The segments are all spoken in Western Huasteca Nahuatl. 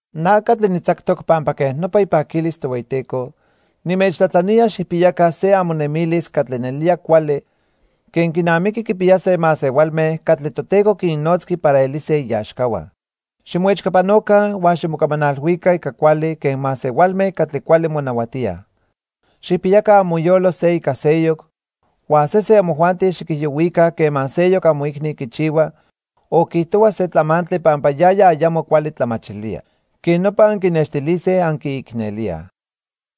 Na catli nitzactoc pampa quej nopa ipaquilis Tohueyiteco, nimechtlajtlanía xijpiyaca se amonemilis catli nelía cuali quen quinamiqui quipiyase masehualme catli Toteco quinnotzqui para elise iaxcahua. Ximoechcapanoca huan ximocamanalhuica ica cuali quen masehualme catli cuali monahuatíaj. Xijpiyaca amoyolo se ica seyoc, huan sesen amojuanti xiquijiyohuica quema seyoc amoicni quichihua o quiijtohua se tlamantli pampa yaya ayamo cuali tlamachilía. Quej nopa anquinextilise anquiicnelíaj.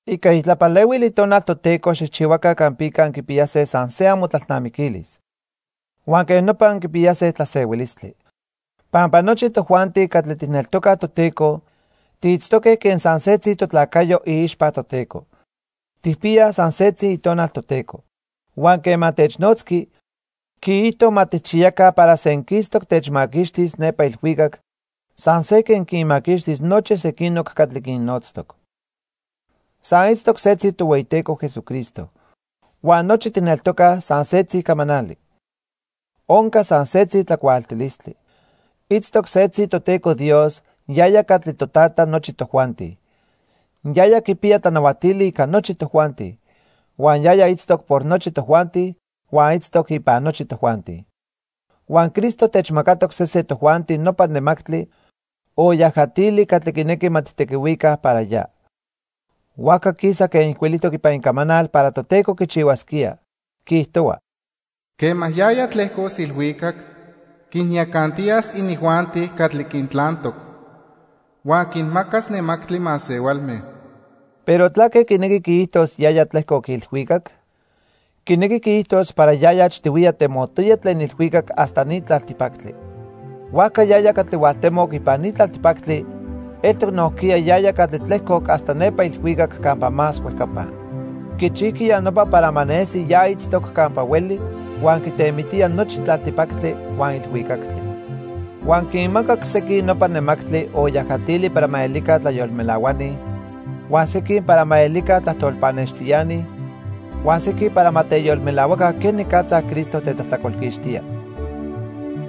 Ica itlapalehuil Itonal Toteco xijchihuaca campica anquipiyase san se amotlalnamiquilis. Huan quej nopa anquipiyase tlasehuilistli. Pampa nochi tojuanti catli tijneltocaj Toteco tiitztoque quen san setzi totlacayo iixpa Toteco. Tijpiyaj san setzi Itonal Toteco. Huan quema technotzqui, quiijto ma tijchiyaca para senquistoc techmaquixtis nepa ilhuicac san se quen quinmaquixtis nochi sequinoc catli quinnotztoc. San itztoc setzi Tohueyiteco Jesucristo. Huan nochi tijneltocaj san setzi camanali. Onca san setzi tlacuaaltilistli. Itztoc setzi Toteco Dios, yaya catli Totata nochi tojuanti. Yaya quipiya tlanahuatili ica nochi tojuanti. Huan yaya itztoc por nochi tojuanti huan itztoc ipan nochi tojuanti. Huan Cristo techmacatoc sesen tojuanti nopa nemactli o yajatili catli quinequi ma tijtequihuica para ya. Huajca quisa quen ijcuilijtoc ipan Icamanal para Toteco quichihuasquía, quiijtohua: "Quema yaya tlejcos ilhuicac quinyacantiyas inijuanti catli quintlantoc. Huan quinmacas nemactli masehualme." Pero ¿tlaque quinequi quiijtos "yaya tlejcoc ilhuicac"? Quinequi quiijtos para yaya achtihuiya temotoya tlen ilhuicac hasta ni tlaltipactli. Huajca yaya catli hualtemoc ipan ni tlaltipactli eltoc nojquiya yaya catli tlejcoc hasta nepa ilhuicac campa más huejcapa. Quichijqui ya nopa para ma nesi ya itztoc campa hueli huan quitemitía nochi tlaltipactli huan ilhuicactli. Huan quinmacac sequin nopa nemactli o yajatili para ma elica tlayolmelahuani, huan sequin para ma elica tlajtol pannextiani, huan sequin para ma teyolmelahuaca quenicatza Cristo tetlajtlacolquixtía.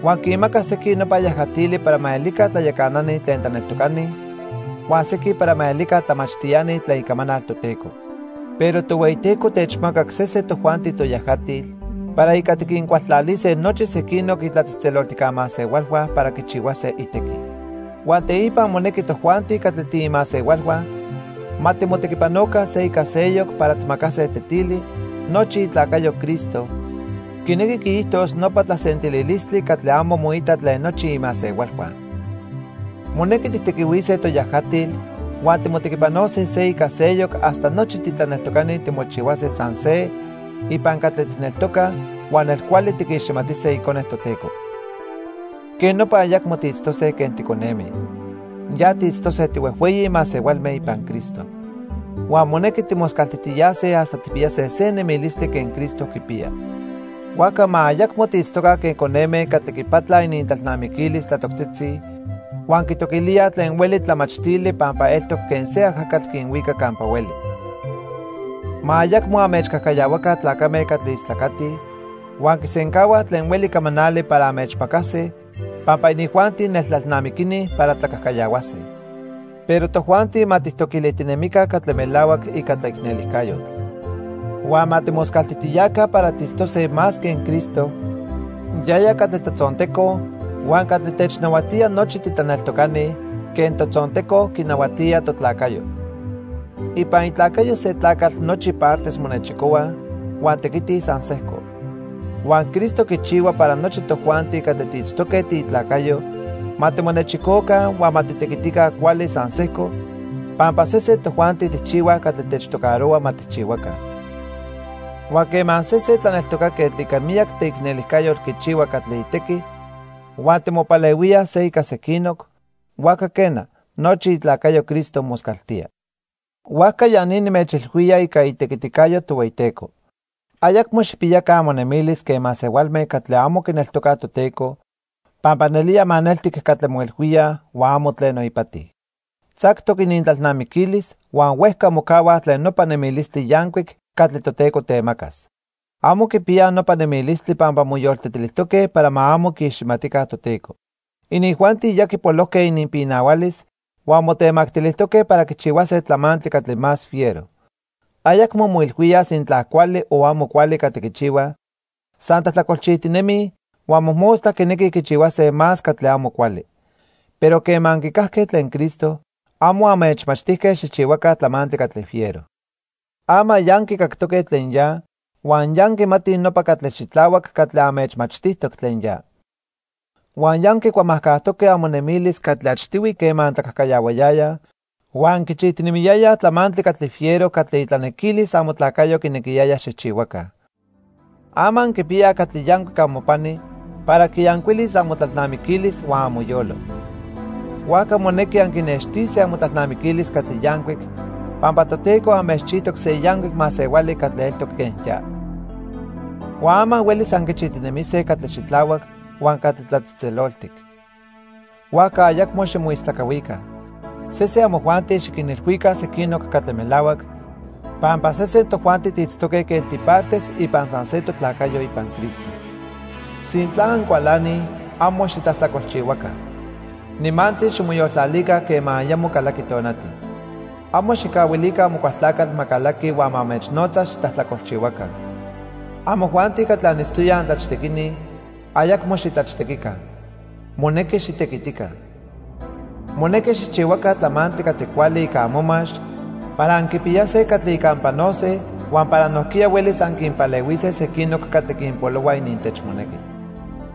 Huan quinmaca sequin nopa yajatili para ma elica tlayacanani tlen tlaneltocani huan sequin para ma elica tlamachtiani tlen Icamanal Toteco. Pero Tohueyiteco techmacac sesen tojuanti toyajatil para ica tiquincualtlalise nochi sequinoc itlatzejtzeloltijca masehualhua para quichihuase itequi. Huan teipa monequi tojuanti catli tiimasehualhua ma timotequipanoca se ica seyoc para tijmacase tetili nochi itlacayo Cristo, quinequi quiijtos nopa tlasentililistli catli amo moita tlen nochi imasehualhua. Monequi tijtequihuise toyajatil huan timotequipanose se ica seyoc hasta nochi titlaneltocani timochihuase san se ipan catli tijneltocaj huan nelcuali tiquiximatise Icone Toteco. Quej nopa ayacmo tiitztose quen ticoneme. Ya tiitztose tihuejhueyi masehualme ipan Cristo. Huan monequi timoscaltijtiyase hasta tijpiyase se nemilistli quen Cristo quipiya. Huajca ma ayacmo tiitztoca quen coneme catli quipatlaj inintlalnamiquilis tlatoctzitzi huan quitoquilíaj tlen hueli tlamachtili pampa eltoc quen se ajacatl quinhuica campa hueli. Ma ayacmo anmechcajcayahuaca tlacame catli istlacatij huan quisencahuaj tlen hueli camanali para anmechmacase, pampa inijuanti neltlalnamiquini para tlacajcayahuase. Pero tojuanti ma tijtoquilijtinemica catli melahuac ica tlaicnelijcayotl. Huan ma timoscaltijtiyaca para tiitztose más quen Cristo, yaya catli totzonteco, huan catli technahuatía nochi titlaneltocani quen totzonteco quinahuatía totlacayo. Ipan itlacayo se tlacatl nochi partes monechicohuaj huan tequitij san sejco. Huan Cristo quichihua para nochi tojuanti catli tiitztoque tiitlacayo ma timonechicoca huan ma titequitica cuali san sejco pampa sesen tojuanti tijchihuaj catli techtocarohua ma tijchihuaca. Huan quema sesen tlaneltocaquetl ica miyac teicnelijcayotl quichihua catli itequi huan timopalehuíaj se ica sequinoc, huajca quena, nochi itlacayo Cristo moscaltía. Huajca ya ni nimechilhuía ica itequiticayo Tohueyiteco. Ayacmo xijpiyaca amonemilis quen masehualme catli amo quineltocaj Toteco pampa nelía maneltic catli moilhuíaj huan amo tleno ipati. Tzactoc inintlalnamiquilis huan huejca mocahuaj tlen nopa nemilistli yancuic catli Toteco temacas. Amo quipiyaj nopa nemilistli pampa moyoltetilijtoque para ma amo quiiximatica Toteco. Inijuanti ya quipolojque ininpinahualis huan motemactilijtoque para quichihuase tlamantli catli más fiero. Ayacmo moilhuíaj sintla cuali o amo cuali catli quichihuaj, san tlajtlacolchijtinemij, huan mojmostla quinequij quichihuase más catli amo cuali. Pero quema anquicajque tlen Cristo, amo anmechmachtijque xijchihuaca tlamantli catli fiero. Ama ya anquicactoque tlen ya huan ya anquimatij nopa catli xitlahuac catli anmechmachtijtoc tlen ya. Huan ya anquicuamajcajtoque amonemilis catli achtihui quema antlacajcayahuayayaj huan anquichijtinemiyayaj tlamantli catli fiero catli itlanequilis amotlacayo quinequiyaya xijchihuaca. Ama anquipiyaj catli yancuic amopani para quiyancuilis amotlalnamiquilis huan amoyolo. Huajca monequi anquinextise amotlalnamiquilis catli yancuic pampa Toteco anmechchijtoc se yancuic masehuali catli eltoc quen ya. Huan ama huelis anquichijtinemise catli xitlahuac huan catli tlatzejtzeloltic. Huajca ayacmo ximoistlacahuica. Sesen amojuanti xiquinilhuica sequinoc catli melahuac pampa sesen tojuanti tiitztoque quen tipartes ipan san se totlacayo ipan Cristo. Sintla ancualanij, amo xitlajtlacolchihuaca. Nimantzi ximoyoltlalica quema ayamo calaqui tonati. Amo xijcahuilica Amocualtlacatl ma calaqui huan ma anmechnotza xitlajtlacolchihuaca. Amojuanti catli anitztoyaj antlachtequini, ayacmo xitlachtequica. Monequi xitequitica. Monequi xijchihuaca tlamantli catli cuali ica amomax para anquipiyase catli ica anpanose huan para nojquiya huelis anquinpalehuise sequinoc catli quinpolohua inintechmonequi.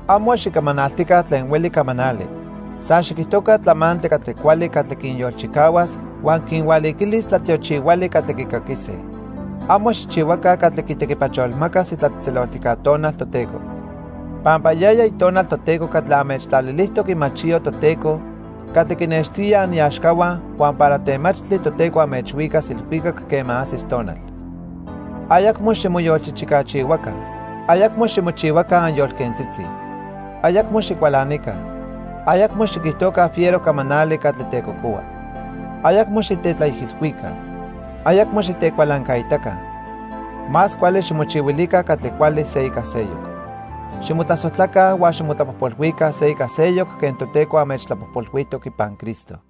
Amo xicamanaltica tlen hueli camanali. San xiquijtoca tlamantli catli cuali catli quinyolchicahuas huan quinhualiquilis tlatiochihuali catli quicaquise. Amo xijchihuaca catli quitequipacholmacas itlatzejtzeloltijca Tonal Toteco. Pampa yaya Itonal Toteco catli anmechtlalilijtoc imachiyo Toteco catli quinextía aniaxcahua huan para temachtli Toteco anmechhuicas ilhuicac quema ajsis tonal. Ayacmo ximoyolchichicachihuaca. Ayacmo ximochihuaca anyolquentzitzi. Ayacmo xicualanica. Ayacmo xiquijtoca fiero camanali catli tecocohua. Ayacmo xitetlaijilhuica. Ayacmo xitecualancaitaca. Más cuali ximochihuilica catli cuali se ica seyoc. Ximotlasojtlaca huan ximotlapojpolhuica se ica seyoc quen Toteco anmechtlapojpolhuijtoc ipan Cristo.